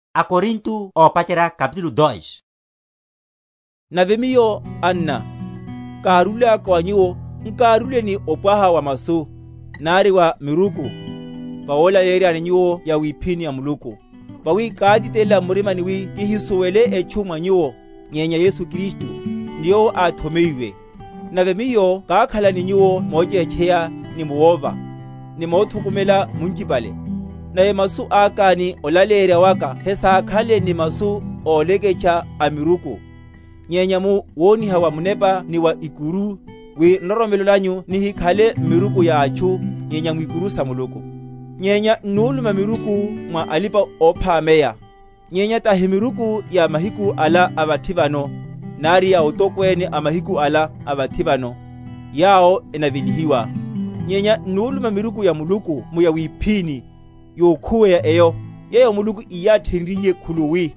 Malaleyeryo a Paulo. Nave miyo, anna, kárúlaka wa nyuwo, nkárúle ni opwaha wa masu, nari wa miruku, vawolaleyeryani nyuwo yawiphíni ya Muluku. Vawi kátitelela m’murimani wi kihisuwele etchu mwa nyuwo, nyenya Yesu Kristu, ni Yowo áthomeyiwe. Nave miyo kákhala ni nyuwo mochétcheya ni mu wova, ni mothukumela munchipale. Nave masu aka ni olaleyerya waka hesákhanle ni masu óleketeha a miruku, nyenya mu woniha wa Munepa ni wa ikuru; wi nroromelo nanyu nihikhale m’miruku ya atchu, nyenya mwikuru sa Muluku. Nyenya n’nuluma miruku mwa alipa‐ophámeya; nyenya tahi miruku ya mahiku ala a vathi vano, nari ya atokwene a mahiku ala a vathi vano, yawo enavelihiwa; nyenya n’nuluma miruku ya Muluku mu yawiphíni, yokhuweya eyo, yeyo Muluku íyathenryiye khuluwi,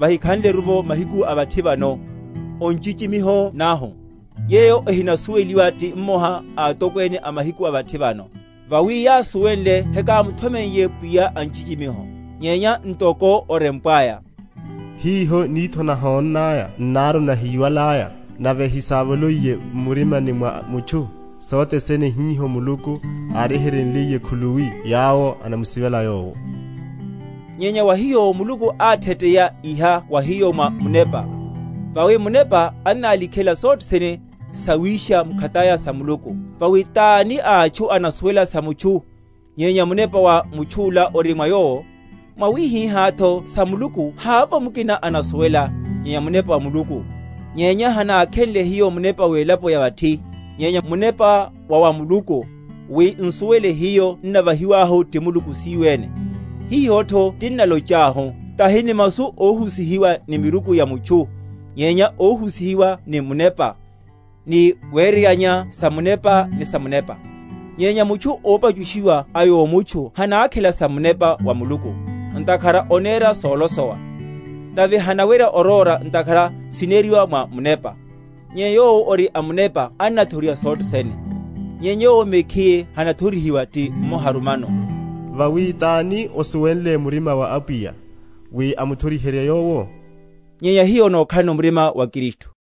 vahikhanleru mahiku a vathi vano, o nchichimiho nahu, yeyo ehinasuweliwa ti mmoha a atokwene a mahiku a vathi vano: vawi yásuwenle heyakamutho?-?meiye pwiya a nchichimiho; nyenya ntoko onarempwaya, Hiho nitho nahónnaya, n’naru nahíwalaya, Nave hisávoloiye m’murimani mwa mutchu, Sothe sene hiho Muluku áryeheryenliye khuluwi yawo enamusivela Yowo. Nyenya wa hiyo Muluku átheteya iha wa hiyo mwa Munepa; vawi Munepa annálikhela sothene, sawisha mkhataya sa Muluku. Vawi tani a atchu anasuwela sa mutchu, nyenya munepa wa mutchu’la ori mwa yowo? mwawihihátho sa Muluku havovo mukina anasuwela, nyenya Munepa wa Muluku. Nyenya hanákhenle hiyo munepa welapo ya vathi, nyenya Munepa wa wa Muluku, wi nsuwele hiyo n’navahiwahu ti Muluku siyo ene. Hihotho tinnalochahu, tahi ni masu óhusihiwa ni miruku ya mutchu, nyenya óhusihiwa ni Munepa; ni wereryanya samunepa ni samunepa. Nyenya mutchu ópachushiwa a yomutchu hanákhela sa Munepa wa Muluku; ntakhara onera solosowa; nave hanawerya orora ntakhara sineriwa mwa munepa. Nyenya yowo ori a munepa annathoriha sothe sene, nyenya yowo mekhiye hanathorihiwa ti mmoharu mano. Vawi tani osuwenle murima wa Apwiya, wi amuthoriherye Yowo? Nyenya hiyo nokhalano murima wa Kristu.